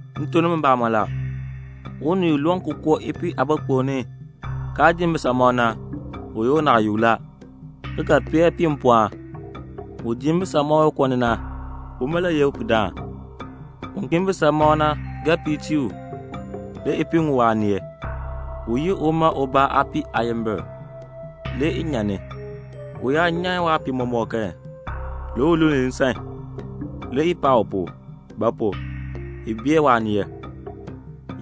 "M tuk nimi mbamɔn la, unii u loon ki koo ipiih aabɔɔkpuŋ ni, kaa dii mbisamɔb na, u ye unaayuk la, ki ga peel ipiih mpɔɔn. Un dii mbisamɔb koo ni na, uma le ye upihdaan. Un kii mbisamɔb na ga piir tii u. Le ipiih ŋun waaneel. U yi uma ubaa aapiih aayimbil, le i nyan ni. U yaa nyan waapiih mɔmɔk kan, le u luln nsan, le i paa u pu; ba pu? i bee waaneel.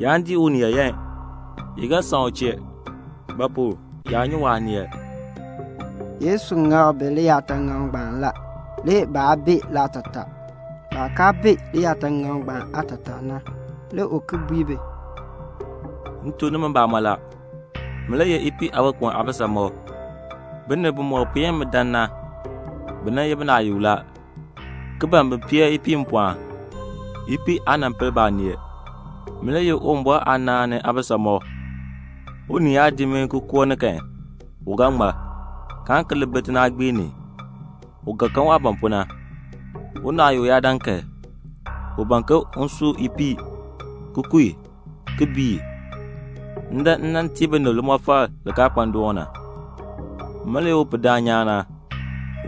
Yaan dii unii yaayan. I ga san u chee; ba pu? yaa nyi waaneel." Yesu ŋak bi liyaataŋakl ngbaan la, le baa bee laatataa. Baah kaa bee liyaataŋakl ngbaan aatataa na, le u ki bui bi, "M tuk nimi mbamɔn la, min le ye ipiih aabɔɔkpuŋ aabisamɔb. Binib bimɔk puen mi dan na, bi nan ye binaayukb la, ki ban bin peel ipiih mpɔɔn. Ipiih aa nan pel baaneel. Min le ye Uwumbɔr aanaan ni aabisamɔb. Unii yaa dii mi ki koo ni kan, u ga ŋmar, kaan ki li bi tinaagbiir ni. U ga kan waah ban pu na. Unaayuk yaa dan kan, u ban ke un su ipiih, ki ku i, ki bii i. M dan m nan tii binib limɔfal li kaa kpa ndoon na. "Min le ye upihdaan nyaan na.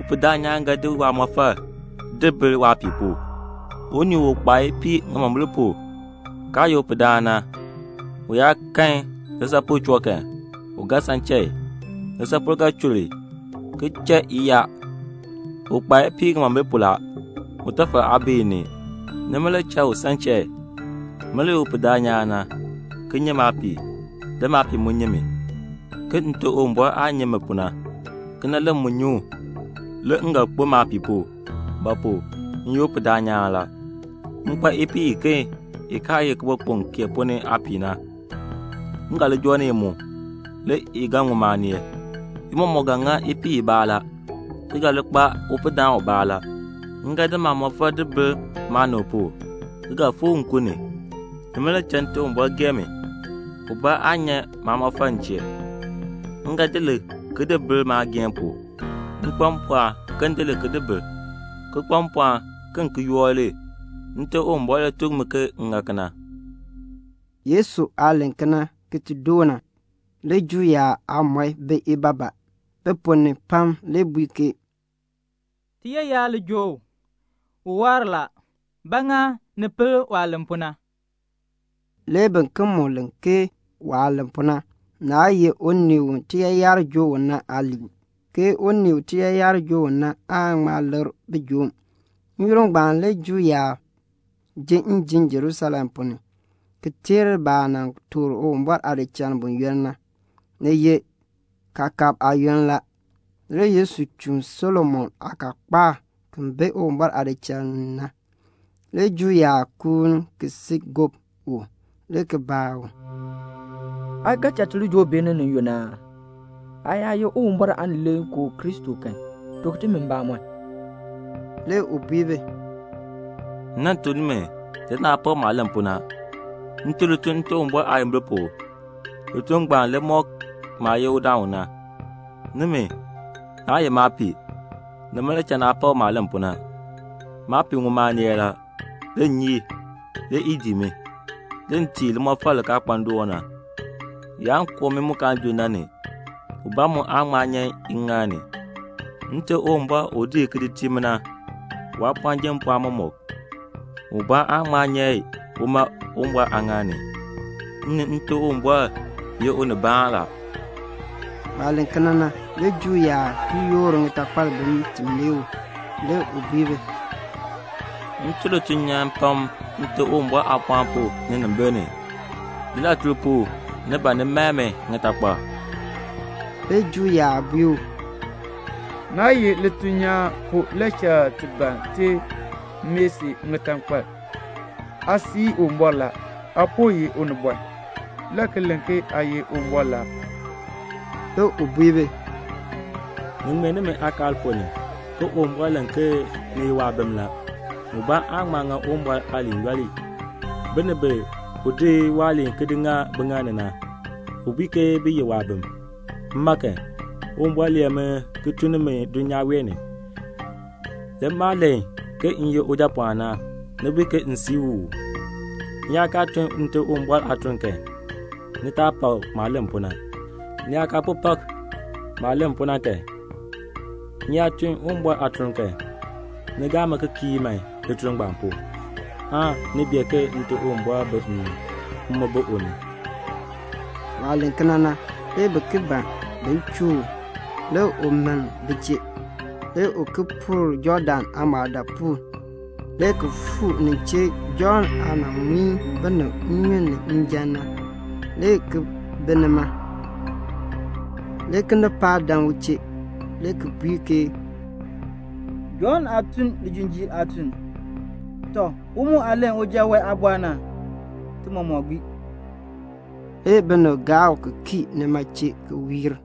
Upihdaan nyaan ga di waamɔfal di bil waapiih pu. Unii u kpaa ipiih ŋimombil pu, kaa ye upihdaan na, u yaa kan lisaapol choo kan, u ga san cha i. Lisaapol ga chur i, ki cha i yaa. U kpaa ipiih ŋimombil pu la. Utafal aa bi i ni. Nima le cha u san cha i. Min le ye upihdaan nyaan na, ki nyi maapiih. Le maapiih mu nyi mi, ke Nte Uwumbɔr aah nyi mi pu na, kena le m mu nyi u. Le m ga kpo maapiih pu; ba pu? m ye upihdaan nyaan na la. M kpa ipiih iken i kaa ye kibɔɔkpuŋ kee ponn ni aapiih na. M ga li joo ni i mu. Le i ga ŋun maaneel. I mɔmɔk ga ŋa ipiih ibaa la, ki ga li kpa upihdaan ubaa la. "M ga di maamɔfal di bil maanib pu, ki ga fikr nkun ni. Nima le cha Nte Uwumbɔr gee mi. Ubaa aan nyan maamɔfal m chee. M ga di li ki di bil maageehn pu. M kpa mpɔɔn ke m di li ki di bil, ki kpa mpɔɔn ke m ki yoor li. Nte Uwumbɔr le tuk mi ke m ŋa kena." Yesu aah len kena ki ti doo na, le Juu yaab aamɔi bi ibaabaa. Bi ponn ni pam le bui ke, "Tiyaayar le joo u. U waar la. Ba ŋa ni pel waah len pu na?" Le biken mu len ke waah len pu na, naa ye unii u tiyaayar joo u na aaliin, ke unii u tiyaayar joo u na aan ŋma likr bijoom. N-yoonn ngbaan le Juu yaab ji njim Jerusalem ponn ni, ki teer baah nan toor Uwumbɔr aadichal buyoonn na. Ni ye kaakab aayoonn la. Le Yesu chuun Solomon aakaakpaak ki bi Uwumbɔr aadichal ni na. Le Juu yaab kuun ki si gob u, le ki baa u, "Aa ga cha ti li joo beeni ni yunn aa? Aa yaa ye Uwumbɔr Aanileekoo Kristo kan, tuk timi mbamɔn." Le u bui bi, "M nan tuk nimi, le naa pak maah len pu na. M tun lituln Nte Uwumbɔr aayimbil pu. Lituln ngbaan le mɔk maah ye udaan u na. Nimi, naa ye maapiih. Nima le cha naa pak maah len pu na. Maapiih ŋun maaneel la. Le m nyi i. Le i dii mi. Le m tii i limɔfal li kaa kpa ndoon na. Yaan koo mmii mu kaan junn na ni. Ubaa mu aan ŋma nyan i ŋŋaal ni. Nte Uwumbɔr u di i ki di tii mi na, waapɔɔn jer mpɔɔn mɔmɔk. Ubaa aan ŋma nyan i uma Uwumbɔr aaŋaal ni. M ni Nte Uwumbɔr ye unibaan la." Waah len kena na, le Juu yaab ki yoor ŋitakpal bin ti mae u. Le u bui bi, "M tun lituln nyaan pam Nte Uwumbɔr aapɔɔn pu ninimbil ni. Lilatuln pu ni ban ni mae mi ŋitakpal?" Le Juu yaab bui u, "Naa ye lituln nyaan pu le cha ti ban ti mae si ŋitakpal. Aa sii Uwumbɔr la. Aa po ye unibɔn, le ki len ke aa ye Uwumbɔr la." Le u bui bi, "Ni ŋmee nimi aakaal ponn ni, ke Uwumbɔr len ke ni ye waabim la. Ubaa aan ŋma ŋa Uwumbɔr aaliin yooli. Binib bi u di waaliin ki di ŋa biŋaal ni na, u bui ke bi ye waabim. Mma kan, Uwumbɔr lee mi ki tun ni mi dulnyaa wee ni. Le maah len ke m ye Ujapɔɔn na, ni bui ke m sii u uu? M yaa kaa tun Nte Uwumbɔr aatuln kan, ni taa pak maah len pu na. Ni yaa kaa po pak maah len pu na kan, m yaa tun Uwumbɔr aatuln kan, ni gaa mi ki kii man lituln ngbaan pu, aan ni bee ke Nte Uwumbɔr bi m ni, m mu bi u ni." Waah len kena na, le bi ki ban bin chuu u. Le u miln bi chee. Le u ki puur Jɔɔdan aamɔɔdaapuul, le ki fuu nin chee Jɔnn aah nan muin binib nnyun ni njan na, le ki bi nima. Le kinipaak dan u chee, le ki bui ke, "Jɔnn aa nan tun lijinjiir aatuln; tɔ, u mu aah len uja wee aabɔr na, ti mɔmɔk gbii." Le binib gaa u ki kii nima chee ki wiir.